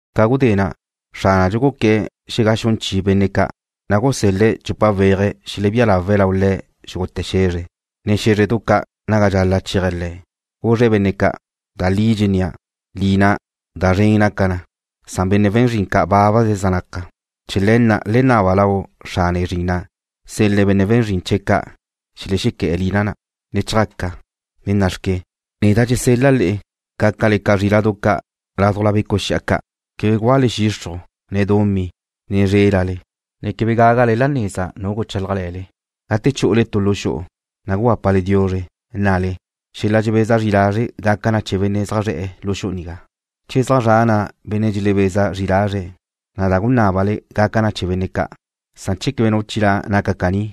Ca gudé na', Xránadxu guqué̱'e̱ xegaxún chi benne' ca', na' gusél-le̱' chupa weaje̱' xelebía lawe̱' lau Le̱' xúgute̱ xe̱zre, ne xé̱zredu ca' naga dxal-la' chéaje̱' Le̱'. Guzre̱' benne' ca': ―Da li dxennéa', lina da zren naca na, na' benne' we̱n zrin bábaze zaj naque̱'. Chee̱ le̱ na' le naba lau Xrane zrin na' sel-le̱' benne' we̱n zrin ca' xelexequé̱'e̱ lina na'. ¡Le chjaca! Le nna'xque, neda' dxesel-la' le'e, gácale ca zríla'du ca' ládujla becu' xi'a ca'. Quebe gúale xixruj, ne dumí, ne zrélale, ne quebe gagale la neza nu guchálajle̱le. Gate chu'ule tu lu xu'u, na' gugápale diuzre, nnale: “Xel-la dxebeza zri lazre' gaca chee̱ benne' zaj zre̱'e̱ lu xu'u nigá.” Che zaj zra' na' benne' dxelebeza zri lazre̱', na' da gunábale gaca chee̱ benne' ca', san che quebe nu chilá' naca caní,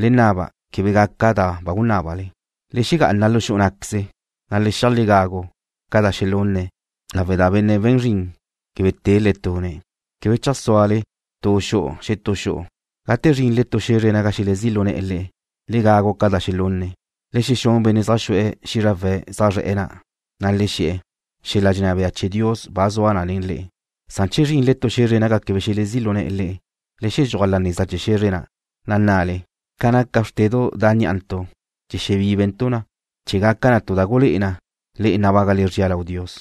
le naba quebe gaca da ba gunábale. Le xegá'ana lu xu'u ná'queze, na' le xi'aj le gagu ca da xelunne̱' lawe' da benne' we̱n zrin quebe te le tune̱'. Quebe cheajsúale tu xu'u xetú xu'u. Gate zrinle tu xe̱zre naga xelezí' lu ne̱'e̱ le'e, le gagu ca da xelunne̱'. Le xexún benne' zaj xu'e̱ xízrawe̱' zaj zre̱'e̱ na', na' le xe̱'e̱: “Xel-la dxenná bea chee̱ Dios ba zua nen le'e.” Che zrinle tu xe̱zre naga quebe xelezí' lu ne̱'e̱ le'e, le xedxúaj la neza chee̱ xe̱zre na', na' nnale: “Ca naca bxrtedu' da' ní'antu' dxexebíbentu' na chee̱ gaca tu da gulé'e na le'e nabágale zria lau Dios.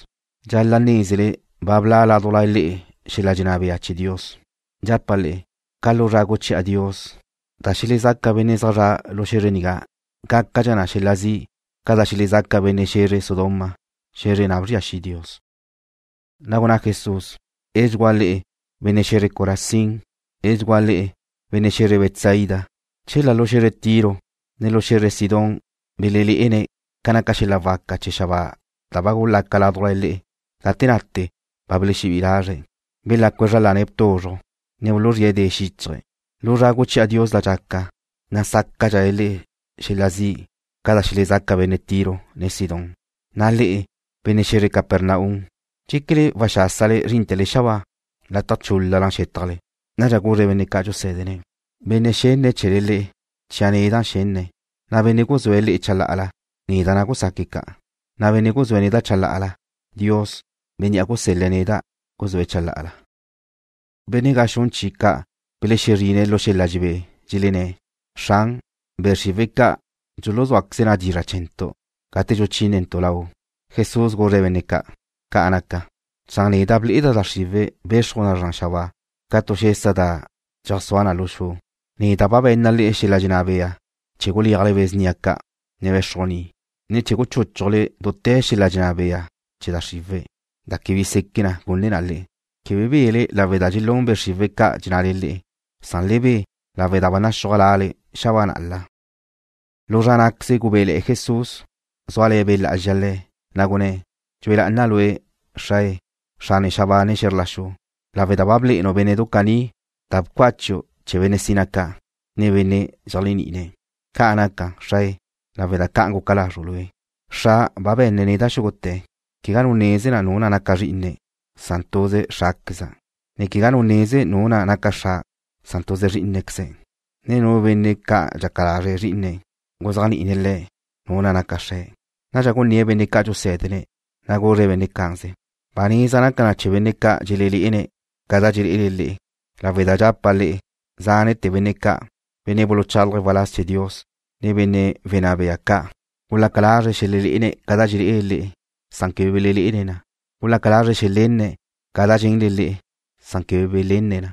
Dxal-la' nézele ba bla' ládujla le'e xel-la dxenná bea chee̱ Dios.” Dxapa' le'e, ca lu zra guchi'a Dios, da xelezaca benne' zaj zre̱'e̱ lu xe̱zre nigá gácadxa na xel-la zi' ca da xelezaca benne' xe̱zre Sodoma, xe̱zre na' bzria xi' Dios. Na' gunná Jesús: ―¡Edxugúa le'e, benne' xe̱zre Corazín! ¡Edxugúa le'e, benne' xe̱zre Betsaida! Chela lu xe̱zre Tiro, ne lu xe̱zre Sidón belelé'ene̱' ca naca xel-la waca chee̱ xabáa da ba gulaca ládujla le'e, gate na'te ba belexebí'i lazre̱', belácue̱' zra lane̱' tuzruj, ne buluzríe̱' de xíchaje̱'. Lu zra guchi'a Dios da dxaca, na' sácadxale le'e xel-la zi' ca da xelezaca benne' Tiro, ne Sidón. Na' le'e, benne' xe̱zre Capernaum, ¿dxéquele waxásale zrínte̱le xabáa? ¡Lataj chúl-lala xétajle! Nadxa guzre̱' benne' ca' dxusé̱dene̱': ―Benne' xenne̱' chee̱le le'e, chia' neda' xenne̱', na' benne' guzúe̱' le'e chalá'ala, neda' na' gusaque̱' ca', na' benne' guzúe̱' neda' chalá'ala, Dios, Bénnea' gusel-le̱' neda', guzúe̱' chalá'ala. Benne' gaxún chi ca' belexezrine̱' lu xel-la dxelebé, dxelenné̱': ―Xran, be' xriwe̱' ca' dxuluzúaqueze na dizra' chee̱ntu' gate dxuchínentu' Lau'. Jesús guzre̱' benne' ca': ―Ca' naca, na' neda' ble'eda' da xriwe̱' be̱xruj na zran xabáa ca tu xesa da dxeajsúa na lu xu. Neda' ba be̱nna' le'e xel-la dxenná bea chee̱ guléajle be̱ snia ca', ne bé̱xrujni, ne chee̱ guchúchujle dute̱ xel-la dxenná bea chee̱ da xriwe̱', na' quebe bi seque gune na le'e. Quebe bele lawe' da dxelún be' xriwe̱' ca dxennale le'e, san le be lawe' da ba naxúaj lale xabáa na'la. Lu zra ná'queze gubéle̱'e̱ Jesús, zúale̱ Be' Lá'azxa Le̱', na' gunné̱': ―Dxue lá'ana' Lue', Xrae, Xrane xabáa ne xe̱zr la xu, lawe' da ba blé'enu' bénne'du caní da bcácheu' chee̱ benne' sina ca', ne benne' dxeléajni'ine̱'. ¡Ca' naca, Xrae, lawe' da ca'an guca lazru' Lue'! ’Xra' ba be̱nne̱' neda' xúgute̱. Quegá nu neze nu na' naca Zrí'ine̱', san tuze Xrá'queza', ne quegá nu neze nu na' naca Xra', san tuze Zrí'inequeze̱', ne nu benne' ca' dxaca lazre' Zrí'ine̱' guzéajni'ine̱' le̱' Nu na' naca Xre̱'. Nadxa guné̱'e̱ benne' ca' dxusé̱dene̱', na' guzre̱' benne' cá'anze: ―Ba neza naca na chee̱ benne' ca' dxelelé'ene̱' ca da dxelé'ele le'e, lawe' da dxapa' le'e, zánete̱ benne' ca', benne' buluchálaje̱' waláz chee̱ Dios, ne benne' wenná bea ca' gulaca lazre̱' xelelé'ene̱' ca da dxelé'ele le'e, san quebe belelé'ene̱' na. Gulaca lazre̱' xelenne̱' ca da dxenle le'e, san quebe belenne̱' na.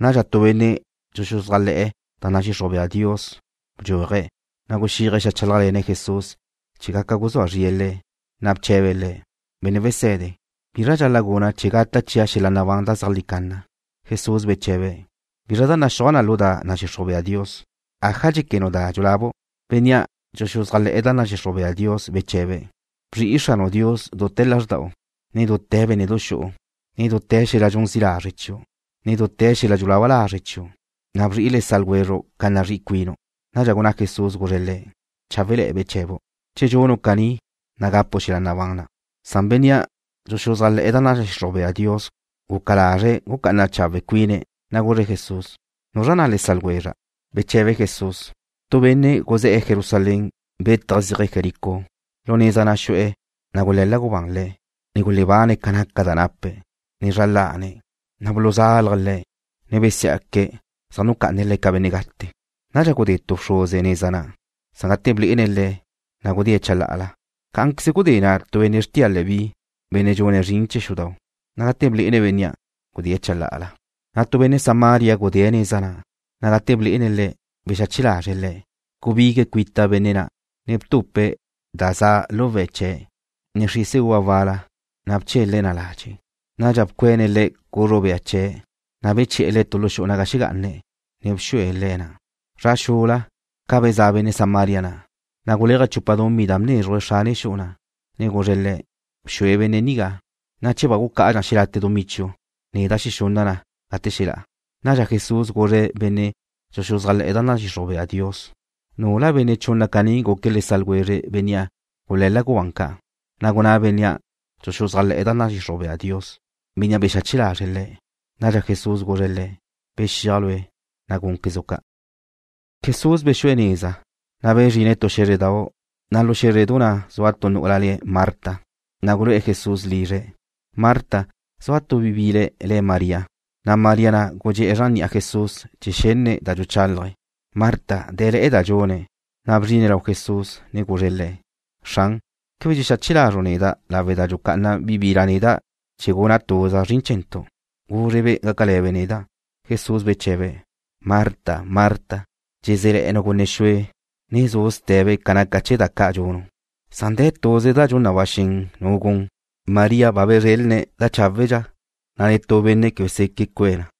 Nadxa tu benne' dxuxuzájle̱'e̱ da nadxixruj bea Dios bdxúaje̱', ne guxíaje̱' xeajchálajle̱ne̱' Jesús chee̱ gaca guzúa zrie̱' Le̱', na' bche̱be̱' Le̱': ―Benne' Wese̱de, ¿bizra dxal-la' guna' chee̱ gata' chia' xel-la nabán da zeajlí canna? Jesús beche̱be̱': ―¿Bizra da naxúaj na lu da nadxixruj bea Dios? ¿Aja dxéquenu' da dxulabu'? Bénnea' dxuxuzájle̱'e̱ da nadxixruj bea Dios beche̱be̱': ―Bzri'i Xranu' Dios dute̱ lázrda'u, ne nen dute̱ bénne'du xu'u, ne nen dute̱ xel-la dxun zi' lazre' chiu', ne nen dute̱ xel-la dxulaba lazre' chiu', na' bzri'i le sa' ljwezru' ca nazrí'i cuinu'. Nadxa gunná Jesús, guzre̱' le̱': ―Cháwe'le̱'e̱ beche̱bu'. Che dxunu' caní, na' gapu' xel-la nabán na'. Bénnea' dxuxuzájle̱'e̱ da nadxixruj bea Dios guca lazre̱' gucá'ana chawe' cuine̱', na' guzre̱' Jesús: ―¿Nuzra na' le sa' lwezra'? Beche̱be Jesús: ―Tu benne' guzé̱'e̱ Jerusalén, bétaje̱' zíaje̱' Jericó. Lu neza na' xu'e̱, na' gule̱la gubán le̱', ne gulebane̱' ca naca da nape̱', ne zra lane̱'. Na' buluzálaje̱' le̱', ne besiá'que̱' zaj nucá'ane̱' le̱' ca benne' gate. Nadxa gudé tu bxruze neza na', na' gate blé'ene̱' le̱', gudée̱' chalá'ala. Cá'anqueze gudé na' tu benne' xrtia Leví, benne' dxune̱' zrin chee̱ xudau', na' gate blé'ene̱' bénnea', gudée̱' chalá'ala. Nadxa tu benne' Samaria gudée̱' neza na', na' gate blé'ene̱' le̱' bexache lazre̱' le̱'. Gubigue̱' cuita benne' na', ne btupe̱' tu da za lu we̱' chee̱', ne xrise uva wal-la, na' bchele̱' na ladxe'. Nadxa bcuene̱' le̱' cuzru bea chee̱', na' beche̱'e̱ le̱' tu lu xu'u naga xegá'ane̱', ne bxue̱' le̱' na'. Zra xula, ca bezá' benne' Samaria na', na' guléaje̱' chupa dumí da bnézruje̱' xrane xu'u na', ne guzre̱' le̱': “Bxue benne' nigá, na' che ba gucá'adxa xelate' dumí chiu', neda' xexunna' na gate xelá'a.” Nadxa Jesús guzre̱' benne' dxuxuzájle̱'e̱ da nadxixruj bea Dios: ―¿Nula benne' chunna caní guque̱' le sa' ljwezre bénnea' gule̱la gubán ca'? Na' gunná bénnea' dxuxuzájle̱'e̱ da nadxixruj bea Dios: ―Bénnea' bexache lazre̱' le̱'. Nadxa Jesús guzre̱' le̱': ―Bexíaj lue', na' gúnquezu' ca'. Jesús bexu'e̱ neza, na' bezrine̱' tu xé̱zredau', na' lu xe̱zre na' zua tu nu'ula le̱' Marta, na' gulu'e̱ Jesús lizre̱'. Marta na', zua tu bi bile̱' le̱' María, na' María na' gudxé'e̱ zran ni'a Jesús chee̱ xenne̱' da dxuchálaje̱'. Marta dé̱le̱'e̱ da dxune̱', na' bzrine̱' lau Jesús, ne guzre̱' Le̱': ―Xran, ¿quebe dxexache lazru' neda' lawe' da dxucá'ana bi bila' neda' chee̱ guna' tuza' zrin chee̱ntu'? Guzre-be' gácale̱be' neda'. Jesús beche̱be̱': ―Marta, Marta, dxezé̱le̱'e̱nu' gunne xue, ne zu' ste̱be ca naca chee̱ da ca' dxunu', san de̱ tuze da dxun na ba xen nu gun. María ba bezrelne̱' da cháwedxa, na' netú benne' quebe seque' cue̱' na.